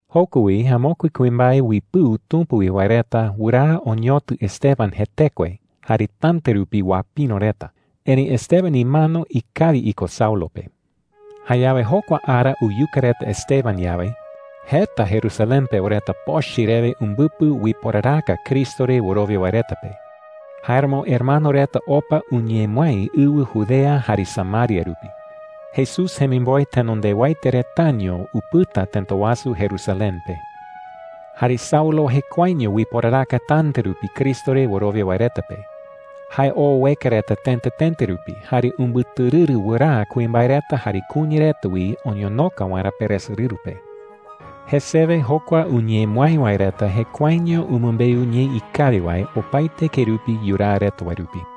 Joko wi amokue kuimbae uipɨu Tumpa wi wae reta wɨraa oñotɨ Esteban jetekue jare täta rupi uapïro reta. Erëi Esteban imano ikawi iko Saulo pe. Saulo ueka Cristo re wɨrowia wae reta uiporaraka chupe reta waerä Jayawe jokua ara uyuka reta Esteban yawe, jeta Jerusalén pewa reta pochɨ rewe umbɨpɨ uiporaraka Cristo re wɨrowia wae reta pe. Jáeramo hermano reta opa uñemɨái ɨwɨ Judea jare Samaria rupi. Jesús jemimboe tenondewaete retaño upɨta tëta wasu Jerusalén pe. Jare Saulo jekuaeño uiporaraka täta rupi Cristo re wɨrowia wae reta pe. Jae oo ueka reta tëta tëta rupi, jare umbɨtɨrɨrɨ wɨraa kuimbae reta jare kuña reta wi oñonoka waerä peresorɨru pe. Jesewe jokua uñemɨái wae reta jekuaeño umɨmbeu ñee ikawi wae opaete kerupi yuraa reta wae rupi.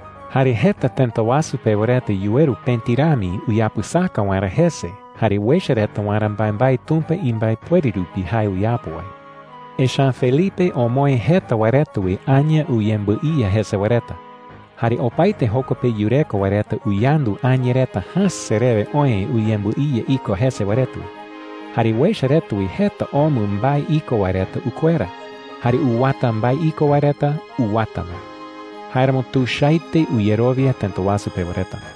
Jare jeta tëta wasu pewa reta yuweru pëti rami uyapɨsaka waerä jese jare uecha reta waerä mbaembae Tumpa imbaepuere rupi jae uyapo wae. Echa’ä Felipe omoë jeta wae reta wi aña uyembɨiya jese wae reta. Jare opaete joko pe yureko wae reta uyandu aña reta jäse rewe oë uyembɨiya iko jese wae reta wi. Jare uecha reta wi jeta omɨ mbae iko wae reta ukuera, jare uwata mbae iko wae reta uwata ma. Jáeramo tuichaete uyerowia tëta wasu pewa reta.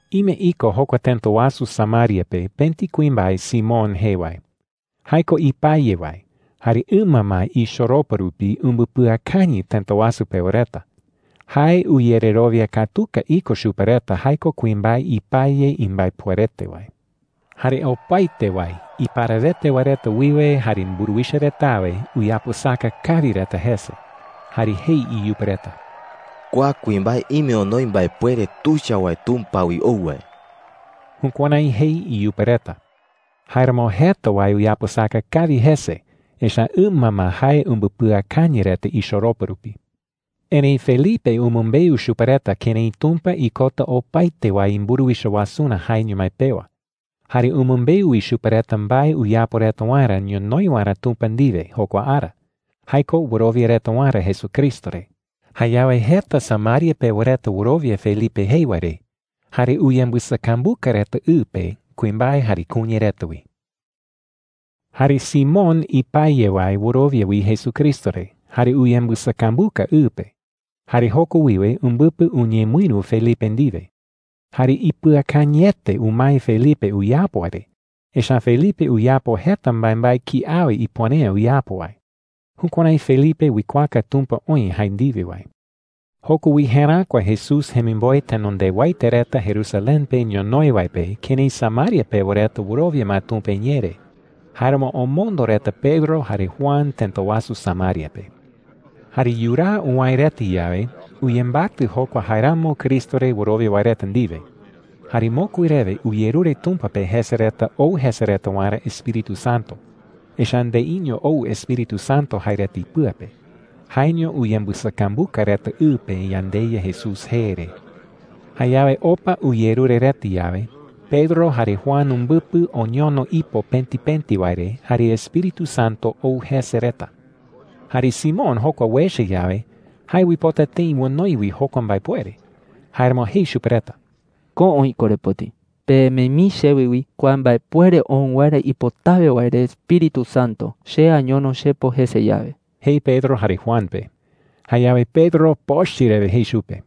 Ime iko jokua tëta wasu Samaria pe pëti kuimbae Simón jee wae. Jae ko ipaye wae, jare ɨma ma ichoropa rupi umbɨpɨakañɨ tëta wasu pewa reta. Jae uyererowia katuka iko chupe reta jae ko kuimbae ipaye imbaepuerete wae. Jare opaete wae, iparawete wae reta wiwe jare mburuwicha retawe, uyapɨsaka kawi reta jese. Jare jei iyupe reta: “Kua kuimbae ime onoi mbaepuere tuicha wae Tumpa wi ou wae.” Jukuärái jei iyupe reta. Jáeramo jeta wae uyapɨsaka kawi jese, echa’ä ɨma ma jae umbɨpɨakañɨ reta ichoropa rupi. Erëi Felipe umɨmbeu chupe reta kërái Tumpa ikota opaete wae imburuwicha wasurä jaeño mái pewa. Jare umɨmbeu wi chupe reta mbae uyapo reta waerä ñonoï waerä Tumpa ndiwe jokua ara – jae ko wɨrowia reta waerä Jesucristo re. Jayawe jeta Samaria pewa reta wɨrowia Felipe jei wae re jare uyembɨsakambuka reta ɨ pe, kuimbae jare kuña reta wi. Jare Simón ipaye wae wɨrowia wi Jesucristo re jare uyembɨsakambuka ɨ pe. Jare joko wiwe umbɨpɨ uñemɨïru Felipe ndiwe. Jare ipɨakañɨete umae Felipe uyapo wae re, echa’ä Felipe uyapo jeta mbaembae kiawe ipuere’ä uyapo wae. Jukuärái Felipe uikuaaka Tumpa oï jae ndiwe wae. Joko wi jeräkua Jesús jemimboe tenondewaete reta Jerusalén pe ñonoï wae pe kërái Samaria pewa reta wɨrowia ma Tumpa iñee re. Jáeramo omondo reta Pedro jare Juan tëta wasu Samaria pe. Jare yuraa uwäe reta yawe, uyembatɨ jokua jaeramo Cristo re wɨrowia wae reta ndiwe. Jare mokui rewe uyerure Tumpa pe jese reta ou jese reta waerä Espíritu Santo. Echa’ä ndeiño ou Espíritu Santo jae reta ipɨa pe. Jaeño uyembɨsakambuka reta ɨ pe yandeYa Jesús jee re. Jayawe opa uyerure reta yawe, Pedro jare Juan umbɨpɨ oñono ipo pëti pëti wae re jare Espíritu Santo ou jese reta. Jare Simón jokua uecha yawe, jae uipota tëi onoi wi jokua mbaepuere. Jáeramo jei chupe reta: “Ko oï korepoti,” jei. “Pemee mii chewe wi kua mbaepuere ou waerä ipotawe wae re Espíritu Santo, che añono chepo jese yawe,” jei Pedro jare Juan pe. Jayawe Pedro pochɨ rewe jei chupe: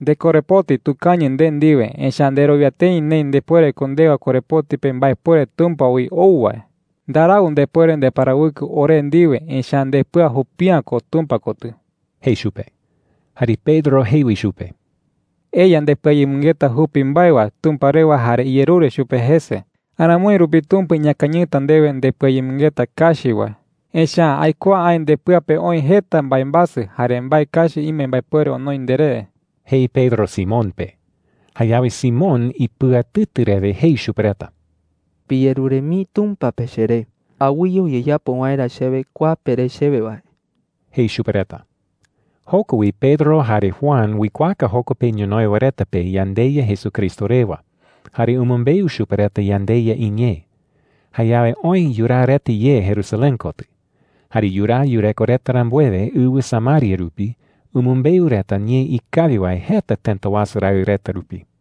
“¡Ndekorepoti tukañɨ nde ndiwe! Echa’ä nderowia tëi neï ndepuere ko ndewa korepoti pe mbaepuere Tumpa wi ou wae,” jei. “Ndarau ndepuere ndeparawɨkɨ ore ndiwe, echa’ä ndepɨa jupi’ä ko Tumpa kotɨ,” jei chupe. Jare Pedro jei wi chupe: “Eya ndepɨayemɨngeta jupi mbae wae Tumpa rewa jare iyerure chupe jese. Aramoi rupi Tumpa iñakañɨta ndewe ndepɨayemɨngeta kachi wae. Echa’ä aikuaa aï ndepɨa pe oï jeta mbaembasɨ, jare mbae kachi ime mbaepuere onoi nderé,” jei Pedro Simón pe. Jayawe Simón ipɨatɨtɨ rewe jei chupe reta: “Piyerure mii Tumpa pe cheré, awɨye uyeyapo waerä chewe kua pere chewe wae,” jei chupe reta. Joko wi Pedro jare Juan uikuaaka joko pe ñonoï wae reta pe yandeYa Jesucristo rewa, jare umɨmbeu chupe reta yandeYa iñee. Jayawe oë yuraa reta ye Jerusalén kotɨ. Jare yuraa yureko rambuewe ɨwɨ Samaria rupi, umɨmbeu reta ñee ikawi wae jeta tëta wasu raɨ reta rupi.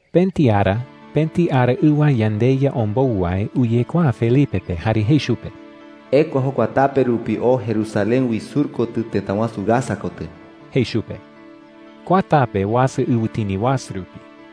Pëti ara pëti araɨwa yandeYa ombou wae uyekuaa Felipe pe jare jei chupe: “Ekua jokua tape rupi oo Jerusalén wi sur kotɨ tëta wasu Gaza kotɨ,” jei chupe. Kua tape uasa ɨwɨtini wasu rupi.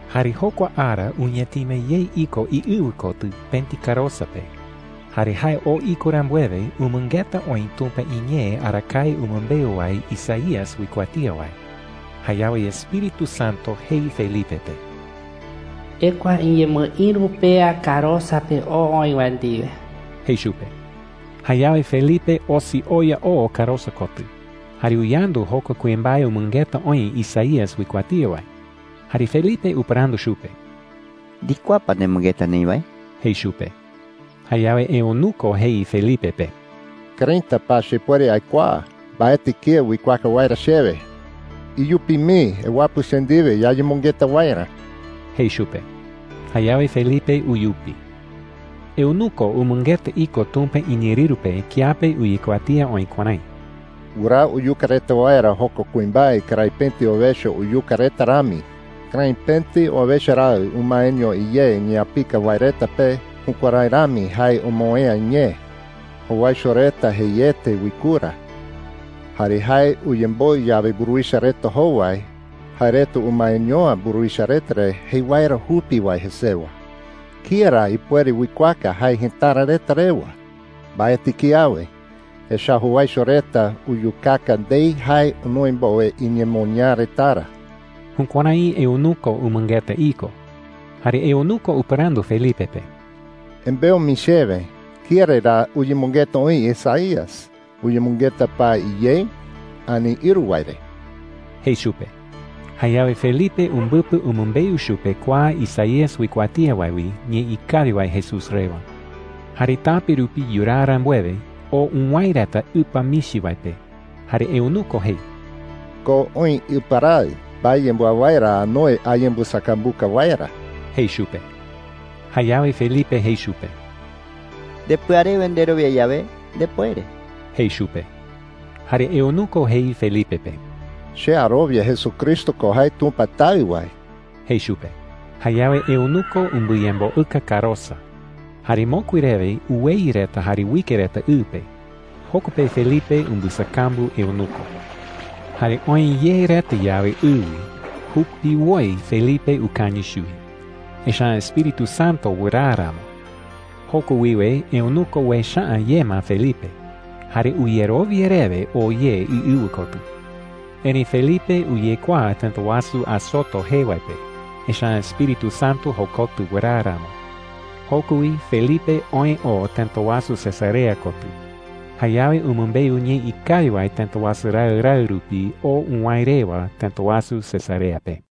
Jare jokua ara uñatima ye iko iɨwɨ kotɨ pëti karosa pe. Jare jae oo iko rambuewe, umɨngeta oï Tumpa iñee arakae umɨmbeu wae Isaías uikuatía wae. Jayawe Espíritu Santo jei Felipe pe: “Ekua iñemɨïru pea karosa pe oo oï wae ndiwe,” jei chupe. Jayawe Felipe osi oya oo karosa kotɨ, jare uyandu jokua kuimbae umɨngeta oï Isaías uikuatía wae. Jare Felipe upɨrandu chupe: “¿Ndikuaa pa nemɨngeta neï wae?” jei chupe. Jayawe eunuco jei Felipe pe: “¿Këraita pa chepuere aikuaa? Mbaetɨ kía uikuaaka waerä chewe,” jei. “Iyupi mii ewapɨ che ndiwe yayemɨngeta waerä,” jei chupe. Jayawe Felipe uyupi. Eunuco umɨngeta iko Tumpa iñeerɨru pe kiape uyekuatía oï kuärái: “Wɨraa uyuka reta waerä jokua kuimbae kërái pëti owecha uyuka reta rami. Kërái pëti owecha raɨ umaeño iyé iñeapika wae reta pe, jukuärái rami jae omoë'ä iñee. Jowaicho reta jeiete uikura. Jare jae uyemboɨ yawe mburuwicha reta jowai, jae reta umaeño’ä mburuwicha reta re jei waerä jupi wae jesewa. ¿Kía ra ipuere uikuaaka jae jëtara reta rewa? Mbaetɨ kiawe, echa’ä jowaicho reta uyukaka ndei jae onoi mbowe iñemoñaa retarä.” Jukuärái eunuco umɨngeta iko. Jare eunuco upɨrandu Felipe pe: “Embeu mii chewe, ¿kía re ra uyemɨngeta oï Isaías? ¿Uyemɨngeta pa iyei ani ïru wae re?” jei chupe. Jayawe Felipe umbɨpɨ umɨmbeu chupe kua Isaías uikuatía wae wi ñee ikawi wae Jesús rewa. Jare tape rupi yuraa rambuewe, oo uwäe reta ɨpa michi wae pe. Jare eunuco jei: “Ko oï ɨpa raɨ. ¿Mbae yembɨawái ra anoi ayembɨsakambuka waerä?” jei chupe. Jayawe Felipe jei chupe: “Ndepɨa rewe nderowia yawe, ndepuere,” jei chupe. Jare eunuco jei Felipe pe: “Che arowia Jesucristo ko jae Tumpa Taɨ wae,” jei chupe. Jayawe eunuco umbɨyemboɨka karosa, jare mokui rewe uweyɨ reta jare uike reta ɨ pe. Joko pe Felipe umbɨsakambu eunuco. Jare oë ye reta yawe ɨ wi, jupiwoi Felipe ukañɨ chuwi, echa’ä Espíritu Santo wɨraa ramo. Joko wiwe eunuco uecha’ä ye ma Felipe. Jare uyerowia rewe oo ye iɨwɨ kotɨ. Erëi Felipe uyekuaa tëta wasu Azoto jee wae pe, echa’ä Espíritu Santo jokotɨ wɨraa ramo. Joko wi Felipe oë oo tëta wasu Cesarea kotɨ. Jayawe umɨmbeu ñee ikawi wae tëta wasu raɨ raɨ rupi oo uwäe rewa tëta wasu Cesarea pe.